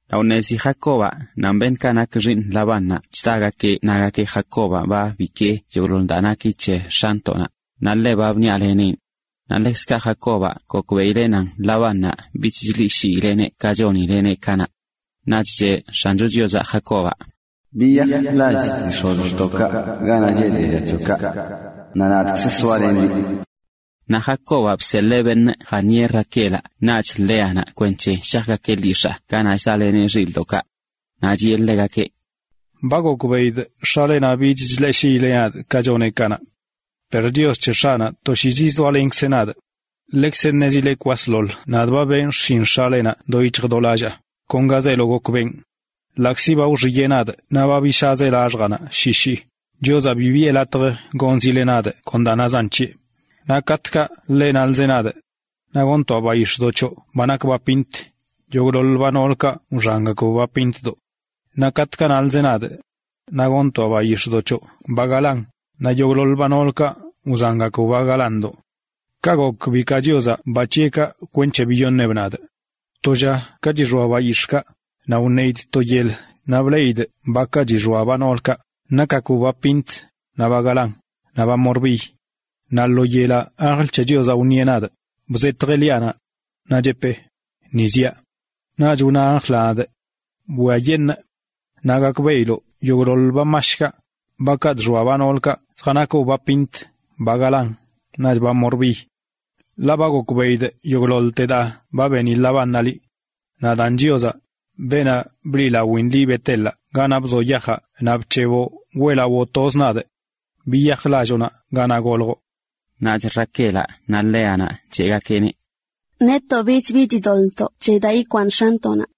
Naꞌ wṉezi Jacobaꞌ nan beṉꞌkaꞌ nak xiiṉ Labánnaꞌ chdagakeꞌ nagakeꞌ: “Jacobaꞌ ba bikee yogꞌḻoḻte daa naki c̱he x̱antoꞌnaꞌ, naꞌ ḻe ba bniꞌaleneꞌn.” Naꞌ ḻekzkaꞌ Jacobaꞌ gokbeꞌileꞌ nan Labánnaꞌ bich chleꞌshiileꞌneꞌ ka chonileꞌneꞌ kanaꞌ. Naꞌch cheꞌ X̱ancho Chiozaꞌ Jacobaꞌ: “Biyaj lall dii x̱ozxtoꞌkaꞌ, ganaꞌ lleꞌ dialla c̱hoꞌkaꞌ, naꞌ nadꞌkzə soalenꞌ liꞌ.” Naꞌ Jacobaꞌ bseḻee beṉꞌ jaṉieꞌ Raquelaꞌ naꞌch Léanaꞌ kwenc̱he shajgakeꞌ lyix̱aa ganaꞌ chdaleneꞌ xilꞌdoꞌkaꞌ. Naꞌ chiꞌe ḻegakeꞌ: ―Ba gokbeꞌidꞌ x̱alenaꞌ bich chleꞌshiileꞌ nadꞌ ka choneꞌ kanaꞌ. Per Chios c̱he x̱aꞌnaꞌ toshiizə zoalenkzeꞌ nadꞌ. Leꞌkzə ṉezile kwasḻoḻ nadꞌ ba benꞌ xshin x̱alenaꞌ do yic̱hj do lallaa, kon ga zeelo gokꞌ benꞌ. Ḻaꞌkzi ba wxiyeꞌ nadꞌ naꞌ ba bishaazeꞌ laxjaa shi shii, Chiozaꞌ bi biꞌe latj gonzileꞌ nadꞌ kon daa nazan c̱heꞌ. Naꞌ katꞌkaꞌ ḻeꞌ wnalzeꞌ nadꞌ: “Naꞌ goṉtoaꞌ bayix̱ꞌdoꞌ c̱hoꞌ ba nak ba pint”, yogꞌḻoḻ ba noolkaꞌ wxangakb ba pintdoꞌ. Naꞌ ka wnalzeꞌ nadꞌ: “Naꞌ goṉtoaꞌ bayix̱ꞌdoꞌ c̱hoꞌ ba galán”, naꞌch yogꞌḻoḻ ba noolkaꞌ wxangakb ba galándoꞌ. Kaꞌ gok bikaa Chiozaꞌ ba c̱heꞌkaꞌ kwenc̱he biyoṉeꞌb nadꞌ. ’To lla ka chixoa bayix̱ꞌkaꞌ, naꞌ wneidꞌ to yel naꞌ bleꞌidꞌ bakaꞌ chixoa ba noolkaꞌ, nakgakb ba pint, naꞌ ba galán, naꞌ ba morbiy. Naꞌ lo yelaꞌ anjl c̱he Chiozaꞌ wṉieꞌ nadꞌ, bzetjeꞌ liaꞌnaꞌ. Naꞌ cheꞌpee: “Ni ziaꞌ.” Naꞌch wna anjlaꞌ nadꞌ: “Bwiayeṉꞌ, naꞌ gakbeꞌiloꞌ yogꞌḻoḻ ba mashkaꞌ, bakaꞌ chxoa ba noolkaꞌ, zjanakb ba pint, ba galán, naꞌch ba morbiy. Ḻaꞌ ba gokbeꞌidꞌ yogꞌḻoḻte daa ba beni Labánnaꞌ liꞌ. Nadaan Chiozaꞌ, beenaꞌ bliꞌlawin liꞌ Bet-elaꞌ ganaꞌ bzoꞌ yajaꞌ naꞌ bc̱heboꞌ weꞌlawoꞌ tozꞌ nadꞌ. Biyaj lalloꞌ ganaꞌ goljoꞌ.” Naꞌch Raquelaꞌ naꞌ Léanaꞌ cheꞌgakeꞌneꞌ: ―Netoꞌ bibi chidoḻꞌntoꞌ daa ikwaaṉ x̱antoꞌnaꞌ.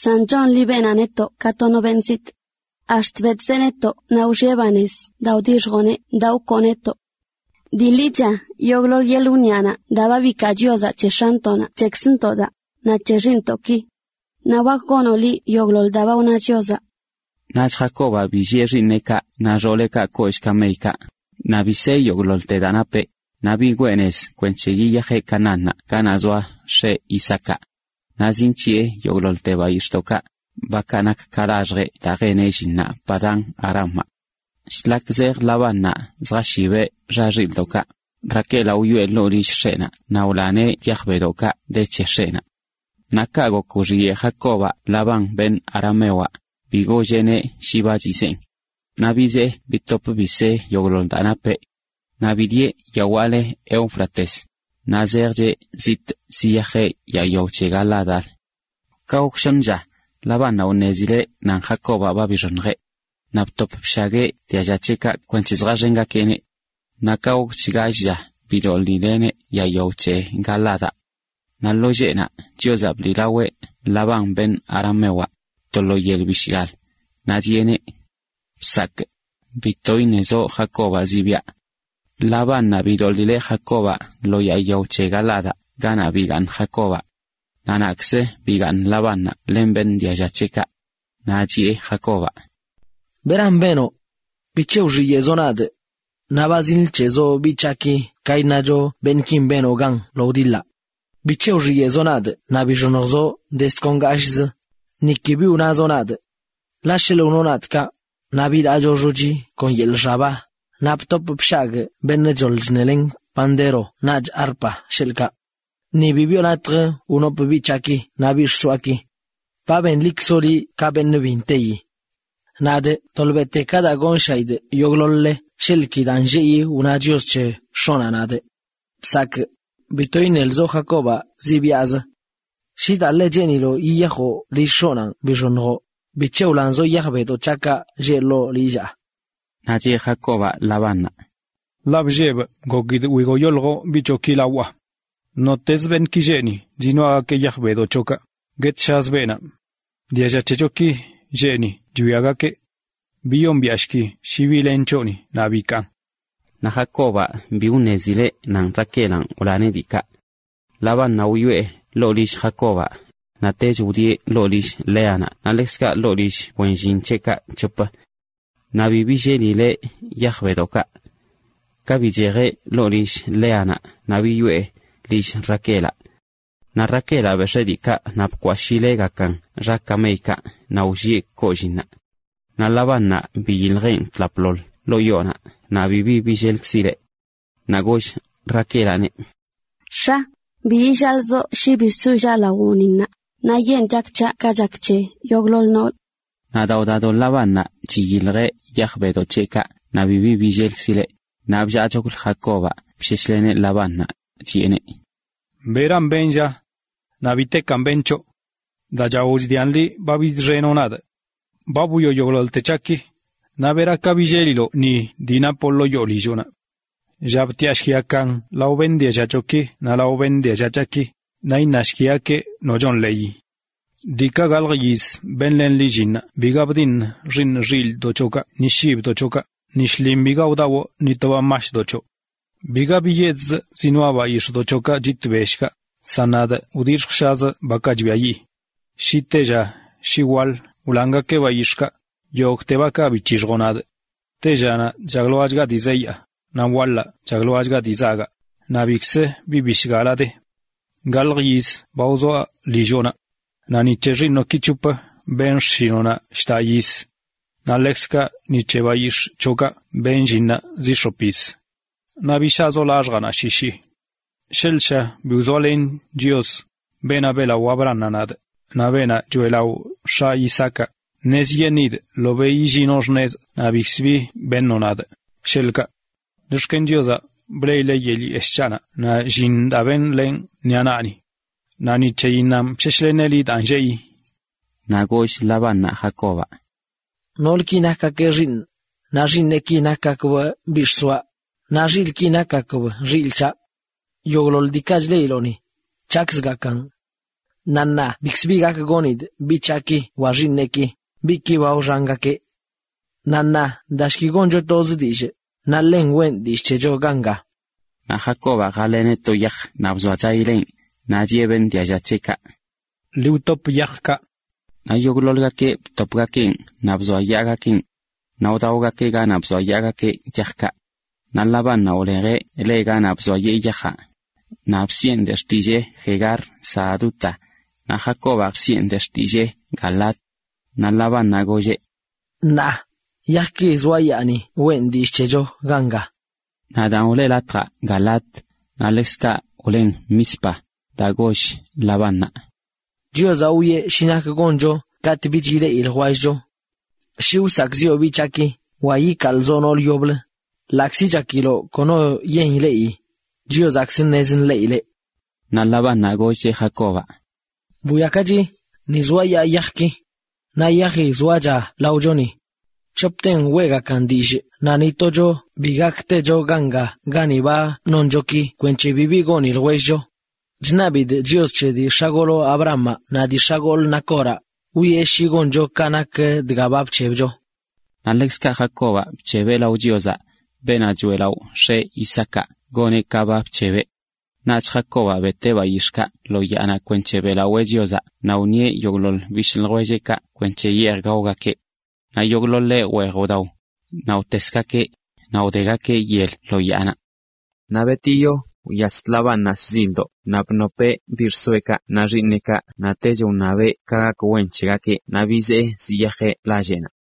San chonli beenaꞌ netoꞌ ka to no beṉꞌ zitꞌ. Ax̱t betꞌzeꞌ netoꞌ naꞌ wxiꞌe banez daa wdixjoꞌ ka wkoo netoꞌ. Dii ḻicha yogꞌḻoḻ yeḻꞌ wniꞌanaꞌ daa ba bikaa Chiozaꞌ c̱he x̱antoꞌnaꞌ c̱hekzntoꞌ daa, naꞌ c̱he xiiṉntoꞌki. Naꞌ wak gonoꞌ liꞌ yogꞌḻoḻ daa ba wna Chiozaꞌ. Naꞌch Jacobaꞌ billieꞌ xiiṉ xooleꞌkaꞌ kollꞌ kameykaꞌ, naꞌ bisee yogꞌḻoḻte daa napeꞌ, naꞌ bigwee nez kwenc̱he yiyajeꞌ Canaánnaꞌ ganaꞌ zoa x̱eꞌ Isaacaꞌ. Naꞌ zinc̱hiꞌe yogꞌḻoḻte bayix̱ꞌdoꞌkaꞌ, bakaꞌ gok laxjeꞌ daa jeneꞌ llinnaꞌ Padán-aramaꞌ. Shlak zej Labánnaꞌ zjashibeꞌ xa xilꞌdoꞌkaꞌ, Raquelaꞌ wyoꞌe ḻoo lilleꞌnaꞌ naꞌ wlaneꞌ yaj bedoꞌkaꞌ de c̱he x̱eꞌnaꞌ. Naꞌ kaꞌ gok wxiyeꞌ Jacobaꞌ Labán beṉꞌ aramewaꞌ, bi golleꞌneꞌ shi ba chizeen. Naꞌ bizee bitop bisee yogꞌḻoḻ daa napeꞌ. Naꞌ bidieꞌ yawaꞌ leꞌ Éufrates, naꞌ zejcheꞌ zitꞌ ziyajeꞌ yaa yao c̱he Galaadaꞌlə. Ka gok shoṉ lla, Labánnaꞌ wṉezileꞌ nan Jacobaꞌ ba bixoṉjeꞌ. Naꞌ btop bshagueꞌ dialla c̱heꞌkaꞌ kwenc̱he zjaxengakeꞌneꞌ. Naꞌ ka gokch gall lla bidoḻileꞌneꞌ yaa yao c̱he Galaadaꞌ. Naꞌ lo lleꞌnaꞌ Chiozaꞌ bliꞌlaweꞌ Labán beṉꞌ aramewaꞌ, to lo yel bishgal, naꞌ chiꞌeneꞌ: “¡Bsakꞌ bito iṉelzoꞌ Jacobaꞌ zibyaꞌ!” Labánnaꞌ bidoḻileꞌ Jacobaꞌ lo yaa yao c̱he Galaadaꞌ ganaꞌ bigaaṉ Jacobaꞌ. Naꞌ naꞌkzə bigaaṉ Labánnaꞌ len beṉꞌ dialla c̱heꞌkaꞌ. Naꞌ chiꞌe Jacobaꞌ: ―¿Beran benoꞌ? ¿Bic̱he wxiyeꞌzoꞌ nadꞌ? Naꞌ ba zinc̱heꞌlzoꞌ biꞌ c̱haꞌki ka iṉacho beṉꞌkin benoꞌ gan lo wdiḻaꞌ. ¿Bic̱he wxiyeꞌzoꞌ nadꞌ naꞌ bixoṉjzoꞌ do ngashꞌzə, niki bi wnazoꞌ nadꞌ? Ḻaꞌ sheḻꞌ wnoꞌ nadꞌ kaꞌ, naꞌ bilaacho xochi kon yeḻꞌ xaba, naꞌ btop bshagꞌ beṉꞌ choḻ chṉeleneꞌ pandero naꞌch arpa, sheḻꞌkaꞌ. Ni bi biꞌo latj wnopꞌ biꞌ c̱haꞌki naꞌ biꞌ xsoaꞌki. ¡Ba benlikzoꞌ liꞌ ka beṉꞌ bi nteyi! Nadꞌ tolbete ka daa gonshaꞌidꞌ yogꞌḻoḻ-le sheḻꞌ ki daa nlleꞌi wna Chios c̱he x̱oꞌnaꞌ nadꞌ: “¡Bsakꞌ bito iṉelzoꞌ Jacobaꞌ zibyaꞌzə!” Shi daa ḻe cheeniloꞌ yiyajoꞌ lill x̱oꞌnanꞌ bixoṉjoꞌ, ¿bic̱he wlanzoꞌ yaj bedoꞌ c̱haꞌkaꞌ lleꞌ ḻoo lillaa? Naꞌch cheꞌ Jacobaꞌ Labánnaꞌ: ―Ḻaꞌ bllebꞌ, gokidꞌ wigoyoljoꞌ biꞌ c̱hoꞌki lawaꞌ. Nottezə beṉꞌki lleꞌ ni zinoaꞌgakeꞌ yaj bedoꞌ c̱hoꞌkaꞌ, guetshazə beenaꞌ. Dialla c̱hechoki lleꞌ ni chwiagakeꞌ: biyombiaꞌshki shi bi len c̱hoꞌni, naꞌ bikaan. Naꞌ Jacobaꞌ bi ṉezileꞌ shi Raquelanꞌ wlaneꞌ diikaꞌ. Labánnaꞌ wyoꞌe ḻoo lill Jacobaꞌ, naꞌ tech wdieꞌ ḻoo lill Léanaꞌ naꞌ ḻekzkaꞌ ḻoo lill wen llin c̱heꞌkaꞌ c̱hop. Naꞌ bi billelileꞌ yaj bedoꞌkaꞌ. Ka bichejeꞌ ḻoo lill Léanaꞌ naꞌ biyoꞌe lill Raquelaꞌ. Naꞌ Raquelaꞌ bex̱ee diikaꞌ naꞌ bkwashileꞌgakan xa kameyaꞌ naꞌ wllieꞌ kolliinnaꞌ. Naꞌ Labánnaꞌ biyiljeꞌn tlapḻoḻ ḻoo yoonaꞌ naꞌ bibi billelkzileꞌ. Naꞌ goll Raquelaꞌneꞌ: ―X̱a, bi illaazoꞌ shi bi sollaꞌ lawoꞌni ṉaa, ṉaayeṉꞌ chak c̱haꞌ ka chak c̱he yogꞌḻoḻ noolə. Naꞌ daa wdado Labánnaꞌ chiyiljeꞌ yaj bedoꞌ c̱heꞌkaꞌ naꞌ bibi billelkzileꞌ, naꞌ bllaachoklə Jacobaꞌ bsheshleneꞌ Labánnaꞌ, chiꞌeneꞌ: ―¿Beran benꞌ, lla? Naꞌ ¿bitekan benꞌ c̱hoꞌ? daa chao chdian liꞌ ba bidxenoꞌ nadꞌ. Ba bwioꞌ yogꞌḻoḻte c̱haꞌki, naꞌ ¿bera ka ba billeliloꞌ ni dii napoꞌ ḻoo yoo lilloꞌnaꞌ? Lla btiꞌashkigakan lao beṉꞌ dialla c̱hoꞌki naꞌ lao beṉꞌ dialla c̱haꞌki, naꞌ iṉashkigakeꞌ nochon leyi. Diikaꞌ gaḻjə yiz benlenꞌ liꞌ llinnaꞌ biga bdiṉ xiiṉ xilꞌdoꞌ c̱hoꞌkaꞌ ni shibdoꞌ c̱hoꞌkaꞌ, ni shlin biga wdawꞌ ni to ba mashdoꞌ c̱hoꞌ. Biga biyedzꞌ zinoaꞌ bayix̱ꞌdoꞌ c̱hoꞌkaꞌ chit bellkaꞌ, san nadꞌ wdixjshazə bakaꞌ chbiayiꞌ. Shi tella shi waḻ wlangakeꞌ bayix̱ꞌkaꞌ, yogꞌte bakaꞌ bc̱hixjoꞌ nadꞌ. Tellanaꞌ bllagloaꞌ dii zeyaa, naꞌ waḻaꞌ bllagloaꞌ dii zagaꞌ, naꞌ bikz bi bishgalaꞌ de. Gaḻj yiz ba wzoa lilloꞌnaꞌ naꞌ ni c̱he xiiṉoꞌki c̱hop benꞌ xshinoꞌnaꞌ lldaꞌ yiz naꞌ ni c̱he bayix̱ꞌki zinc̱hiꞌa zi x̱op yiz. Naꞌ bishaazoꞌ laxjaa shi shii. Sheḻꞌ sha bi wzoalen Chios, beenaꞌ beꞌlaꞌo Abrahamaꞌ nadꞌ, naꞌ beenaꞌ choeꞌlaꞌo x̱aꞌ Isaacaꞌ, ṉezyeṉidꞌ ḻobeꞌ yillinoꞌ() xnezꞌ naꞌ bikzə bi beṉoꞌ nadꞌ, sheḻꞌkaꞌ. Chox̱ken Chiozaꞌ bleꞌileꞌ yeḻꞌ yeshꞌ c̱haꞌnaꞌ naꞌ llin daa benlenꞌ ṉiꞌa naꞌni. Naꞌ ni c̱heyinnanꞌ bsheshleneꞌ liꞌ daa nlleꞌi. Naꞌ goll Labánnaꞌ Jacobaꞌ: ―Noolki nakgakeꞌ xiiṉꞌ, naꞌ xiiṉeꞌki nakgakbꞌ biꞌ xsoaꞌ, naꞌ xilꞌki nakgakb xilꞌ c̱haꞌ. Yogꞌḻoḻ diikaꞌ chleꞌiloꞌ ni, c̱haꞌkzgakan. Naꞌ ṉaa bikz bi gak gonidꞌ biꞌ c̱haꞌki wa xiiṉeꞌki, biꞌki ba wxangakeꞌ. Naꞌ ṉaa dashki, goncho toz dillꞌ, naꞌ ḻen weꞌn dillꞌ c̱hecho ganga. Naꞌ Jacobaꞌ jaḻeneꞌ to yaj naꞌ bzoachayileꞌn, naꞌ chiꞌe beṉꞌ dialla c̱heꞌkaꞌ: ―Ḻi wtop yajkaꞌ. Naꞌ yogꞌḻoḻgakeꞌ btopgakeꞌn naꞌ bzoayaagakeꞌn. Naꞌ wdaogakeꞌ ganaꞌ bzoayaagakeꞌ yajkaꞌ. Naꞌ Labánnaꞌ wlejeꞌ le ganaꞌ bzoayee yajaꞌ, naꞌ bsiꞌen de xtillee “Jegar Sahaduta”, naꞌ Jacobaꞌ bsiꞌen de xtillee “Galaad”. Naꞌ Labánnaꞌ golleꞌ: ―Ṉaa, yajki zoayaa ni weꞌn dillꞌ c̱hecho ganga. Naꞌ daan wle latjaꞌ Galaad. Naꞌ ḻekzkaꞌ wlen Mizpa, daa goll Labánnaꞌ: ―Chiozaꞌ wwieꞌ shi nak goncho katꞌ bichga ileꞌi ljwellcho. Shi wsakꞌziꞌo biꞌ c̱haꞌki wa ikaalzoꞌ noolə yoblə, ḻaꞌkzi chakiloꞌ kono yen ileꞌyi, Chiozaꞌkzə ṉez nḻeꞌileꞌ. Naꞌ Labánnaꞌ gollcheꞌ Jacobaꞌ: ―Bwiakachi, ni zoayaa yajki. Naꞌ yaji zoacha laochoni. C̱hopten weꞌgakan dillꞌ naꞌ ni tocho bi gak techo ganga gani ba noncho ki kwenc̱he bibi goni ljwellcho. Chṉabidꞌ Chios c̱he dii x̱agoloꞌ Abrahamaꞌ naꞌ dii x̱agolꞌ Nacoraꞌ, wwieꞌ shi goncho ka nak dga ba bc̱hebcho. Naꞌch ḻekzkaꞌ Jacobaꞌ bc̱hebeꞌ lao Chiozaꞌ, beenaꞌ choeꞌlaꞌo x̱eꞌ Isaacaꞌ, goneꞌ ka ba bc̱hebeꞌ. Naꞌch Jacobaꞌ beteꞌ bayix̱ꞌkaꞌ lo yaanaꞌ kwenc̱he beꞌlawee Chiozaꞌ naꞌ wṉieꞌ yogꞌḻoḻ bishꞌ ljwelleꞌkaꞌ kwenc̱he yeej gaogakeꞌ. Naꞌ yogꞌḻoḻeꞌ weej wdao, naꞌ wtesgakeꞌ, naꞌ wdegakeꞌ yel lo yaanaꞌ. Naꞌ betiyo wyas Labánnaꞌ shzildoꞌ naꞌ bnopeꞌ biꞌ xsoeꞌkaꞌ naꞌ xiiṉeꞌkaꞌ naꞌtech wṉabeꞌ ka gak wen c̱hegakeꞌ naꞌ bizee ziyajeꞌ lalleꞌnaꞌ.